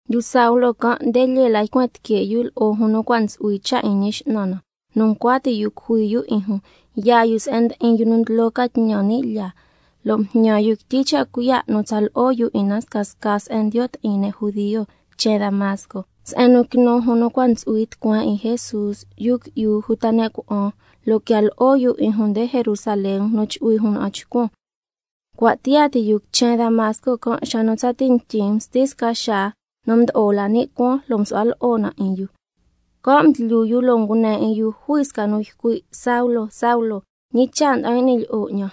u Saulo can', nde lyee la ycuen tique' yu lo'o jun nu cua' ntsu'hui cha' 'in Ñi X'nan na, nu ncua ti' yu cujui yu 'in jun, can' cha' yaa yu se'en ndi'in yu nu ndlo ca tñan ni' lyaa, lo' mjñan yu quityi cha' cuiya' nu tsa lo'o yu 'in na scasca se'en ndiyo' ti'in ne' judio quichen Damasco, se'en nu quinu jun nu cua' ntsu'hui tucueen 'in Jesús, yu qui'yu uta ne' cuna'an, lo' quian lo'o yu 'in jun nde Jerusalén nu chu'hui jun na'an chcuan. Cua' tiyaa ti yu quichen Damasco xa nu tsati ntyin msti sca xaa nu mdo'o la ni' cuaan, lo' msu'hua lo'o na 'in yu. Can' mdlyu yu, lo' ngune 'in yu jui sca nu ycui': Saulo, Saulo, ¿ñi cha' nda'an y'ni lyi'o 'ñan?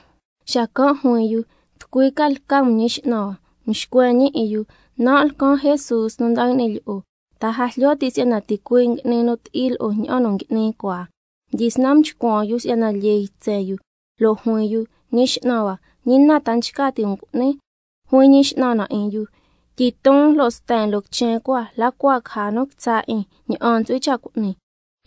Xacan' juin yu: ¿Tucui ca lca 'un Ñi X'nan hua? Mxcuen ñi 'in yu: Nan' lcan Jesús nu nda'an y'ni lyi'o. ¿Ta a jlyo ti' si'yana ticuii' ngui'ni nu ti'i lo'o, ña'an nu ngui'ni cua? Mdyisnan mchcuan yu si'yana lyee ytsen yu, lo' juin yu: Ñi X'nan hua, ¿ñi na ta nchca ti' um cu'nin? Xacan' juin Ñi X'nan na 'in yu: Tyiton lo' sten loo quichen cua, la cua caja nu quitsa' 'in ña'an ntsu'hui cha' cu'ni.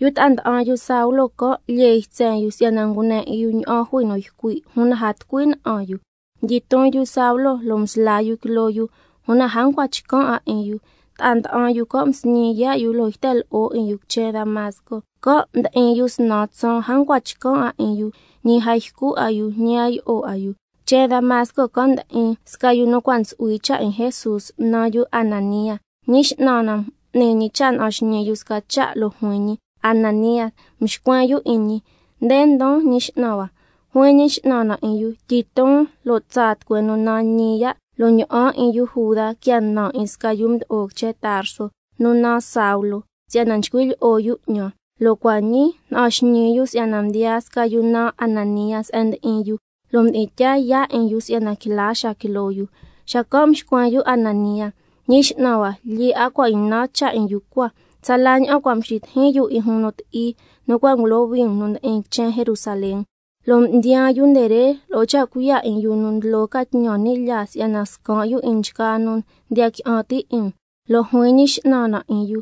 Yu ta'a nda'an yu Saulo can', lyee ytsen yu si'yana ngune ca 'in yu ña'an jui nu ycui', una a tucui na'an yu. Mdyiton yu Saulo lo' msla yu quiloo yu, una a ncua chcan' 'a 'in yu. Ta'a nda'an yu can' msñi yaa' yu, lo' yten lo'o 'in yu quichen Damasco. Can' mdi'in yu snan tsaan a ncua chcan' 'a 'in yu, ñi a ycu 'a yu, ñi a yi'o 'a yu. Una quichen Damasco can' ndi'in sca yu nu cua' ntsu'hui cha' 'in Jesús, naan yu Ananía. Ñi X'nan na m'ni ñi cha' na'an xñii yu sca cha', lo' juin ñi: Ananía. Mxcuen yu 'in ñi: Nde ndon, Ñi X'nan hua. Xacan' juin Ñi X'nan na 'in yu: Tyiton, lo' tsaa tucueen nu naan Ñi Ya', lo' ña'an 'in yu Juda quia nan 'in sca yu mdo'o quichen Tarso nu naan Saulo, si'yana nchcui' lyi'o yu 'ñan, lo' cua' ñii na'an xñii yu si'yana mdiyaa sca yu naan Ananía se'en ndi'in yu, lo' mdi'in tyaa yaa' 'in yu si'yana quila xaa quiloo yu. Xacan' mxcuen yu Ananía: Ñi X'nan hua, lyee 'a cua' ynan cha' 'in yu cua, tsala ña'an cua' mxitijin yu 'in jun nu ti'i, nu cua' ngulohui um nu ndi'in quichen Jerusalén, lo' mdiyaan yu nde re lo'o cha' cuiya' 'in yu nu ndlo ca tñan ni' lyaa can', si'yana scan' yu 'in nchgaa nu ndiya qui'an ti' 'in um. Lo' juin Ñi X'nan na 'in yu: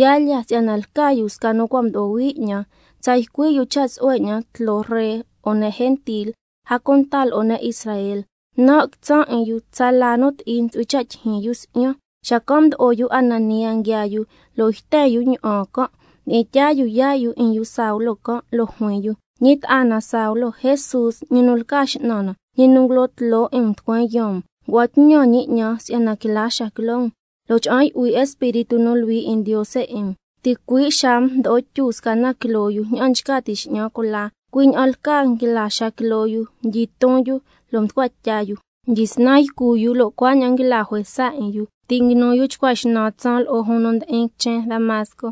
Yaa lya, si'yana lca yu sca nu cua' mdo'o hui 'ñan, si'yana tsa ycui' yu cha' tsu'hue 'ñan tloo ree lo'o ne' gentil, a cunta lo'o ne' Israel. Nan' quitsan' 'in yu tsala nu ti'i ntsu'hui cha' tyijyin yu si'yan. Xacan' mdo'o yu Ananía nguiaa yu, lo' yten yu ña'an can'. Mdi'in tyaa yu yaa' yu 'in yu Saulo can', lo' juin yu: Ñi ta'a na Saulo, Jesús ñi nu lca X'nan na, ñi nu ngulo'o tloo 'in um tucueen yaan um, ngua'an tñan ñi 'ñan si'yana quila xaa quiloo um, a cunta cha'an yu'hui Espíritu nu Luhui 'in Ndiose 'in um. Ticui' xaa can', mdo'o tyu sca na quiloo yu ña'an nchca ti' x'ñan cula, cui' ña'an lcaa nguila xaa quiloo yu, mdyiton yu lo' mducua tya yu. Mdyisnan ycu yu, lo' cuaña'an nguila juesa 'in yu. Ti' nguinu yu chcua xnan tsaan lo'o jun nu ndi'in quichen Damasco.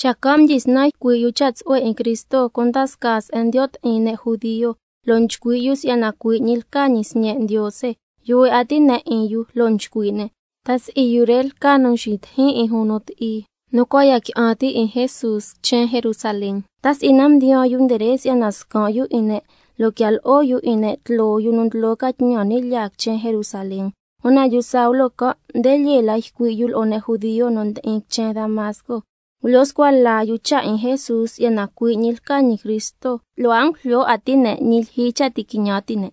Xacan' mdyisnan ycui' yu cha' tsu'hue 'in Cristo cunda scaa se'en ndiyo' ti'in ne' judio, lo' nchcui' yu si'yana cui' ñi lca ñi Sñe' Ndiose. Yuhue 'a ti' ne' 'in yu, lo' nchcui' ne': ¿Ta si'i yu re lca yu nu mxitijin 'in jun nu ti'i, nu cua' ya qui'an ti' 'in Jesús quichen Jerusalén? ¿Ta si'i can' cha' ca mdiyaan yu re si'yana scan' yu 'in ne', lo' quia lo'o yu 'in ne' tloo yu nu ndlo ca tñan ni' lyaa quichen Jerusalén? Una yu Saulo can' nde lyee la ycui' yu lo'o ne' judio nu ndi'in quichen Damasco. Ngulyo scua la yu cha' 'in Jesús si'yana cui' ñi lca ñi Cristo, lo' a ngujlyo 'a ti' ne' ñi lyijyi cha' ti' quiñan ti' ne'.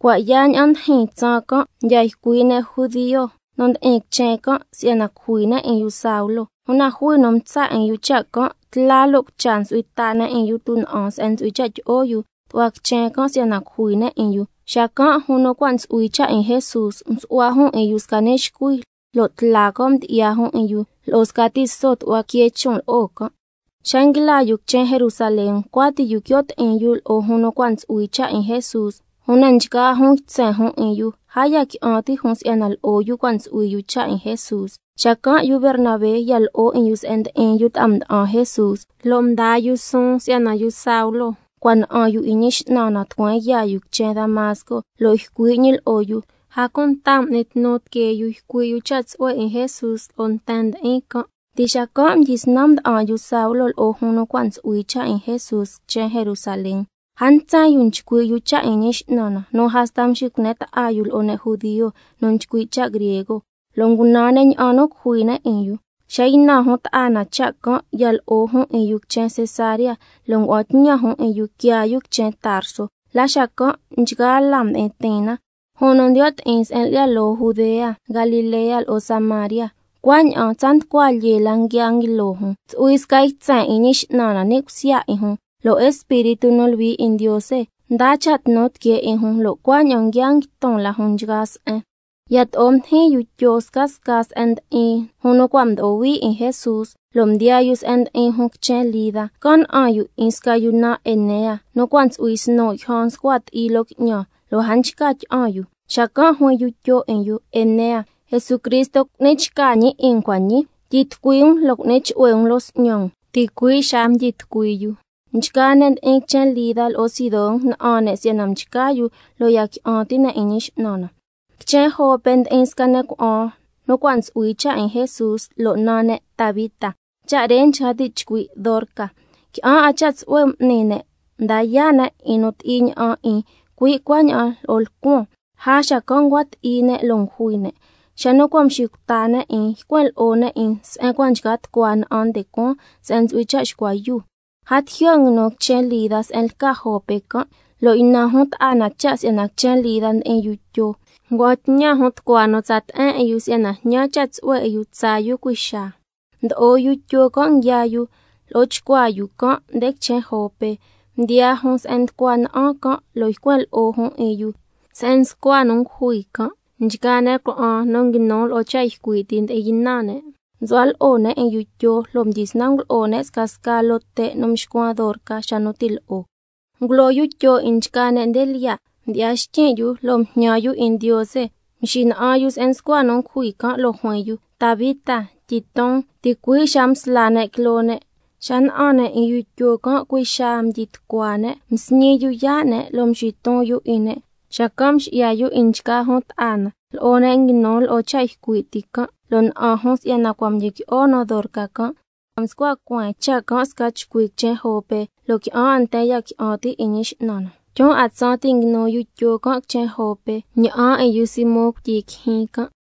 Cua' yaa ña'an ndijin tsaan can', mdya ycui' ne' judio nu ndi'in quichen can' si'yana cujui ne' 'in yu Saulo, una jui nu mtsa' 'in yu cha' can'. Tla lo' cucha ntsu'hui ta ne' 'in yu tuna'an se'en ntsu'hui cha' tyi'o yu tu'hua quichen can' si'yana cujui ne' 'in yu. Xacan' jun nu cua' ntsu'hui cha' 'in Jesús, msu'hua jun 'in yu sca ni' xcuhui, lo' tla can' mdyi'ya jun 'in yu lo'o sca tiso tu'hua quee chon' lo'o can'. Una xa nguila yu quichen Jerusalén, ncua ti' yu quio' ti'in yu lo'o jun nu cua' ntsu'hui cha' 'in Jesús, una nchgaa jun ytsen jun 'in yu, a ya qui'an ti' jun si'yana lo'o yu cua' ntsu'hui yu cha' 'in Jesús. Xacan' yu Bernabé ya lo'o 'in yu se'en ndi'in yu ta'a mda'an Jesús, lo' mdaa yu suun si'yana yu Saulo cua' na'an yu 'in Ñi X'nan na tucueen yaa yu quichen Damasco lo' ycui' ñi lo'o yu, a cunta m'ni tnu tiquee yu ycui' yu cha' tsu'hue 'in Jesús lo'o nten ndi'in can'. Cuaña'an mdyisnan mda'an yu Saulo lo'o jun nu cua' ntsu'hui cha' 'in Jesús quichen Jerusalén. A ntsen yu nchcui' yu cha' 'in Ñi X'nan na, nu hasta nxicune ta'a yu lo'o ne' judio nu nchcui' cha' griego, lo' ngunan ne' ña'an nu cujui ne' 'in yu. Xa ynan jun ta'a na cha' can', ya lo'o jun 'in yu se'en lca Cesarea, xacan' ngua'an tñan jun 'in yu quiaa yu quichen Tarso. La xacan' nchgaa laa mdi'in tiin na, jun nu ndiyo' ti'in se'en lca Judea, Galilea, lo'o Samaria. Cuaña'an tsa nducua lyee la nguia nguilo jun, ntsu'hui sca ytsen 'in Ñi X'nan na ni' cusya 'in jun, lo' Espíritu nu Luhui 'in Ndiose ndaa cha' tnu tiquee 'in jun, lo' cuaña'an nguia nguiton la jun nchgaa se'en. Yato'o mdijin yu Tyo scasca se'en ndi'in jun nu cua' mdo'o hui 'in Jesús, lo' mdiyaa yu se'en ndi'in jun quichen Lida. Can' na'an yu 'in sca yu naan Enea, nu cua' ntsu'hui snu' yjan nscua ti'i loo qui'ñan, lo' a nchca tyi'an yu. Xacan' juin yu Tyo 'in yu: Enea, Jesucristo cu'ni chca ñi 'in um cua' ñii, tyitucui um lo' cu'ni chu'hue um loo s'ñan um. Ticui' xaa mdyitucui yu. Nchgaa ne' ndi'in quichen Lida lo'o Sidón na'an ne' si'yana mchca yu, lo' ya qui'an ti' ne' 'in Ñi X'nan na. Quichen Jope ndi'in sca ne' cuna'an nu cua' ntsu'hui cha' 'in Jesús, lo' naan ne' Tabita, lo' cha' re nchca ti' chcui': Dorca. Qui'an 'a cha' tsu'hue m'ni ne', mda yaa' ne' 'in nu ti'i ña'an 'in, cui' cuaña'an lo'o lcuan. Lja xacan' ncua ti'i ne' lo' ngujui ne'. Xa nu cua' mxicuta ne' 'in, ycuen lo'o ne' 'in se'en cua' nchca tucua na'an nde cuaan, se'en ntsu'hui cha' xcua yuu. A tijyo' nguinu quichen Lida se'en lca Jope can', lo' ynan jun ta'a na cha' si'yana quichen Lida ndi'in yu Tyo, cui' xaa ngua'an tñan jun tucua nu tsa te'en 'in yu si'yana jñan cha' tsu'hue 'in yu tsaa yu cui' xaa. Mdo'o yu Tyo can', nguiaa lo'o chcuaa yu can' nde quichen Jope, mdiyaa jun se'en nducua na'an can' lo' ycuen lo'o jun 'in yu se'en nscua nu ngujui can'. Nchgaa ne' cuna'an nu nguinu lo'o cha' ycui' ti ndi'in ynan ne', msu'hua lo'o ne' 'in yu Tyo lo' mdyisnan ngulo'o ne' scasca loo te' nu mxcuan Dorca xa nu ti' lo'o. Ngulo yu Tyo can' 'in nchgaa ne' nde lyiya'. Mdyi'ya xtyin' yu lo' mjñan yu 'in Ndiose. Xacan' mxina'an yu se'en nscua nu ngujui can', lo' juin yu: Tabita, tyiton. Ticui' xaa msla ne' quiloo ne'. Xa na'an ne' 'in yu Tyo can', cui' xaa mdyi tucua ne', msñi yu yaa' ne', lo' mxiton yu 'in ne'. Xacan' mxi'ya yu 'in nchgaa jun ta'a na lo'o ne' nu nguinu lo'o cha' ycui' ti can', lo' na'an jun si'yana cua' mdyiqui'o nu Dorca can'. Mscua cueen cha' can' sca chcui quichen Jope, lo' qui'an 'a nten ya qui'an ti' 'in Ñi X'nan na. Tyun 'a tsaan ti' nguinu yu Tyo can' quichen Jope, na'an 'in yu Simón cuityi quijyin can'.